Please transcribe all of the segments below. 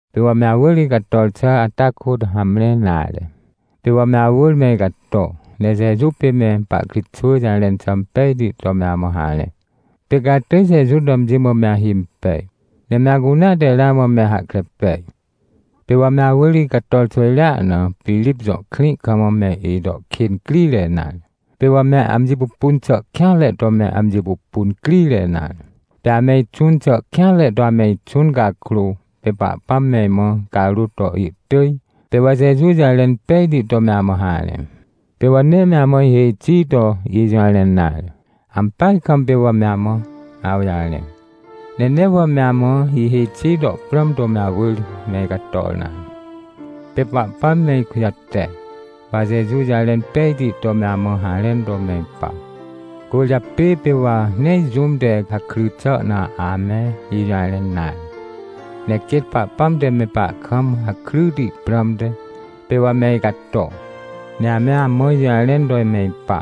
Pê wa me awỳr icator xà ata kôt hamre nare. Pê wa me awỳr me icato, ne Jeju pê me pahkritxwỳ jarẽn xà impejti to me amã harẽ. Pê ca atỳj Jeju to amji mã me ahimpej, ne me acunea te ramã me hahkre pej. Pê wa me awỳr icator xwỳjrea na, Pirip jõ krĩ kam me ito kên crire nare, pê wa me amji pupun xà kêanre to me amji pupun crire nare. Pê ame ixũn xà kêanre to ame ixũn cakrô, pê Pahpãm me imã icarôt to ihtỳj, pê wa Jeju jarẽn pejti to me amã harẽ. Pê wa nee me amã ihêj xi to ijũjarẽn nare, ampeaj kam pê wa me amã awjarẽ. Ne nee wa me amã ihêj xi to prãm to me awỳr me icator nare. Pê Pahpãm me ikujate, wa Jeju jarẽn pejti to me amã harẽn to me ipa. Cwỳrjapê pê wa nee jũm te hakry xà na ame ijũjarẽn nare, ne quêt Pahpãm te me pahkam hakryti prãmte, pê wa me icato. Ne ame amã ijũjarẽn to me ipa,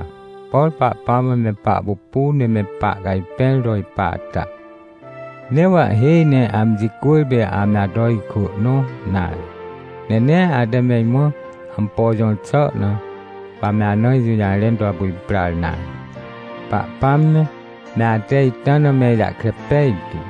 por Pahpãm me pahpupu ne me pahcajpẽr to ipa ata. Nee wa ihêj ne amji cwỳrpê ame ato ikwỳ nõ nare. Ne nee ate me imã ampo jõr xà na, wa me amã ijũjarẽn to apu iprar nare. Pahpãm me, me ate ita na me ijahkre pejtu.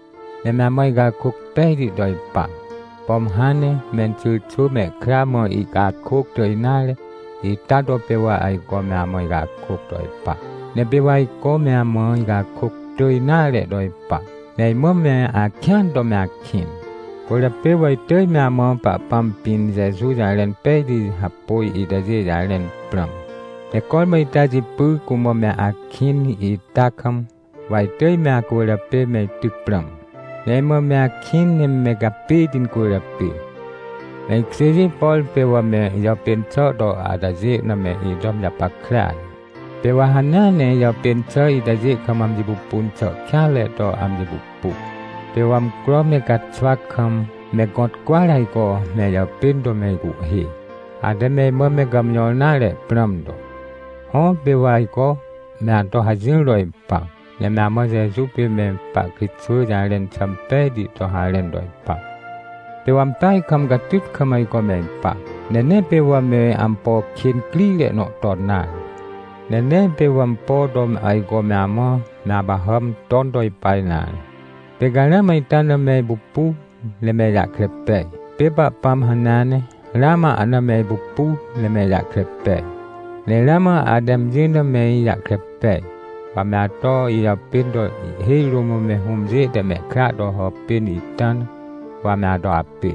Ne me amã icakôc pejti to ipa, pom hãn ne menxyrxwỳ mehkra mã ihcakôc tỳj nare, ita to pê wa ajco me amã icakôc to ipa, ne pê wa ajco me amã icakôc tỳj nare to ipa. Ne imã me akĩan to me akĩn. Cwỳrjapê wa itỳj me amã Pahpãm pĩn Jeju jarẽn pejti hapôj itajê jarẽn prãm. Ne cormã ita jipy cumã me akĩn ita kam, wa itỳj me acwỳrjapê me ityc prãm, ne imã me akĩn ne me gapêti incwỳrjapê. Me ikjêjê, por pê wa me ijàpên xà to atajê na me ito amji japackrea ne. Pê wa hanea ne ijàpên xà itajê kam amji pupun xà kêanre to amji pupu. Pê wa amcro me caxwa kam me gõt cwỳar ajco me ijàpên to me icuhhê, ate me imã me gàmjõr nare prãm to. Hõ, pê wa ajco me ato hajỹr to ipa, ne me amã Jeju pê me pahkritxwỳ jarẽn xà impejti to harẽn to ipa. Pê wa ampeaj kam catyt kam ajco me ipa, ne nee pê wa me ampo kên crire nõ ton nare. Ne nee pê wa ampo to ajco me amã me apahàm ton to ipa nare. Pê ca ramã ita na me ipupu, ne me ijahkre pej, pê Pahpãm hanea ne ramã ahna me ipupu ne me ijahkre pej. Ne ramã ate amji na me ijahkre pej, wa me ato ijàpên to ihhêj rũm me hũmjê te mehkra to hàpên ita na, wa me ato apê.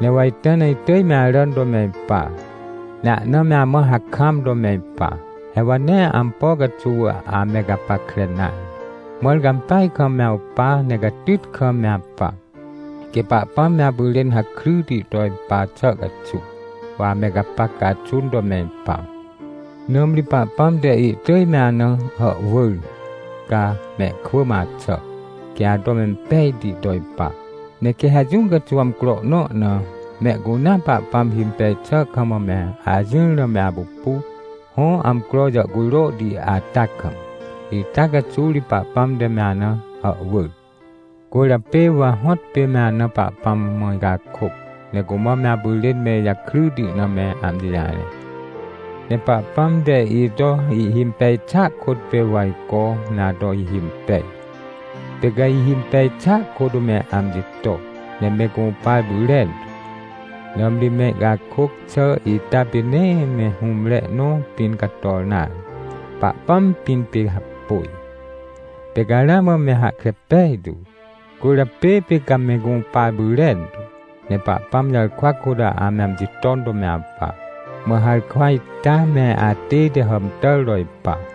Ne wa ita na itỳj me aràn to me ipa, ne ahna me amã hakam to me ipa. He wa nee ampo caxuw ame gapackre nare, mãr ca ampeaj kam me awpa ne catyt kam me apa. Quê Pahpãm me apyrên hakryti to ipa xà caxuw, wa ame gapac caxun to me ipa. Nãmri Pahpãm te ihtỳj me ana hàhwỳr, ca mehkwỳ mã axà, quê ato impejti to ipa. Ne quê ha jũ caxuw amcro nõ na, mehcunea Pahpãm himpej xà kam me ajỹr na me apupu, hõ amcro jàhcujrohti ata kam. Ita caxuw ri Pahpãm te me ana hàhwỳr. Cwỳrjapê wa hõtpê me ana Pahpãm mã icakôc, ne cumã me apyrên me ijakryti na me amji jarẽ. Ne Pahpãm te ito ihhimpej xàa kôt pê wa ajco me ato ihimpej, pê ca ihhimpej xàa kôt me amji to. Ne me gũpar pyrentu, nãmri me icakôc xà ita pê nee me hũmre nõ pĩn cator nare. Pahpãm pĩn pê hapôj, pê ca ramã me hahkre pejtu. Cwỳrjapê pê ca me gũpar pyrentu, ne Pahpãm jarkwa kôt ame amji ton to me apa. Mã harkwa ita me atête hàmtàr to ipa.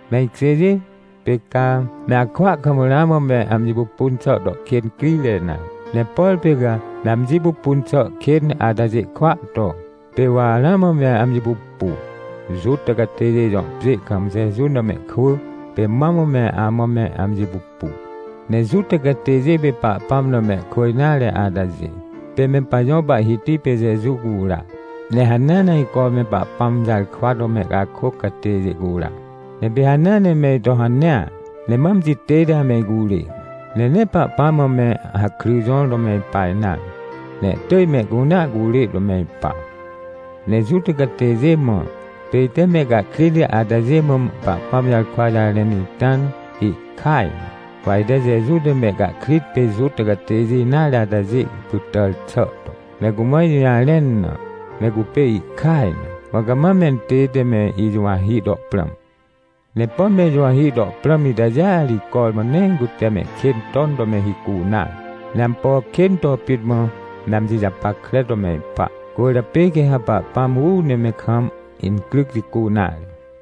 Me ikjêjê, pê ca, me akwỳa kam ramã me amji pupun xà to kên crire nare. Ne por pê ca me amji pupun xà kên atajê kwỳa to, pê wa ramã me amji pupu, Juta catêjê jõ pjê kam Jeju na mehkwỳ pê mam me amã me amji pupu. Ne Juta catêjê pê Pahpãm na mehkwỳ nare atajê, pê me pajõ Pahhiti pê Jeju cura, ne hanea ajco me Pahpãm jarkwa to mehcakôc catêjê cura. Ne pê hanea ne me ito hanea, ne ma amji tête ame icurê. Ne nee Pahpãm mã me hakry jõr to me ipa nare, ne ihtỳj mehcunea curê to me ipa. Ne Juta catêjê mã, pê ite mehcahkrit atajê mã Pahpãm jarkwa jarẽn ita na, ihkaj na. Wa ite Jeju te mehcahkrit pê Juta catêjê nare atajê pytàr xà to, me cumã ijũjarẽn na, me cupê ihkaj na. Mã cama mentête me ijuwahi to prãm. Ne pom me ijuwahi to prãm itajêa ri cormã nee cute mehkên ton to me hicu nare. Ne ampo kên to pit mã me amji japackre to me ipa. Cwỳrjapê quê ha Pahpãm uu ne me kam incryc jicu nare.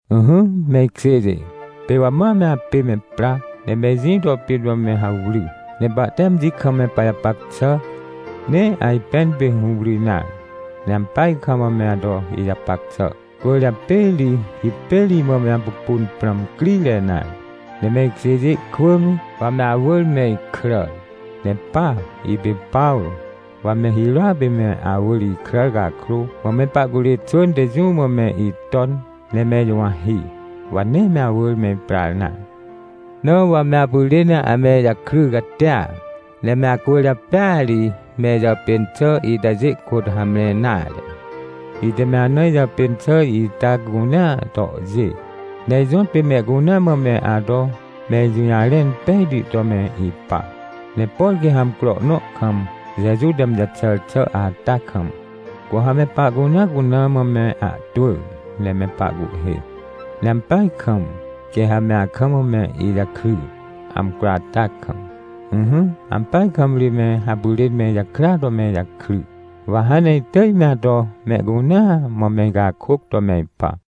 Ỹhỹ, me ikjêjê, pê wa ma me apê me pra, ne me ijĩ to pit mã me hawry, ne pahte amji kam me pajapac xà, nee ajpẽn pê hũwry nare. Ne ampeaj kam me ato ijapac xà, cwỳrjapê ri hipêr imã me apupun prãm crire nare. Ne me ikjêjê kwỳ me, wa me awỳr me ikràr. Ne pa, ipê Pawrô, wa me hirôa pê me awỳr ikràr cakrô, mã me pahcurê xwỳn te jũ mã me iton, ne me ijuwahi, wa nee me awỳr me iprar nare. Na wa me apyrên ame ijakry catia, ne me acwỳrjapêa ri me ijàpên xà itajê kôt hamre nare. Ite me ana ijàpên xà ita cunea tohjê, ne ijõtpê mehcunea mã me ato me ijũjarẽn pejti to me ipa. Ne por quê ha amcro nõ kam, Jeju te amji jaxàr xà ata kam, cu ha me pahcunea cuna mã me ahtwỳ ne me pahcuhhê. Ne ampeaj kam, quê ha me akam me ijakry, amcro ata kam. Ỹhỹ, ampeaj kam ri me apyrên me ijakrya to me ijakry. Wa hãn ne itỳj me ato mehcunea mã me icakôc to me ipa.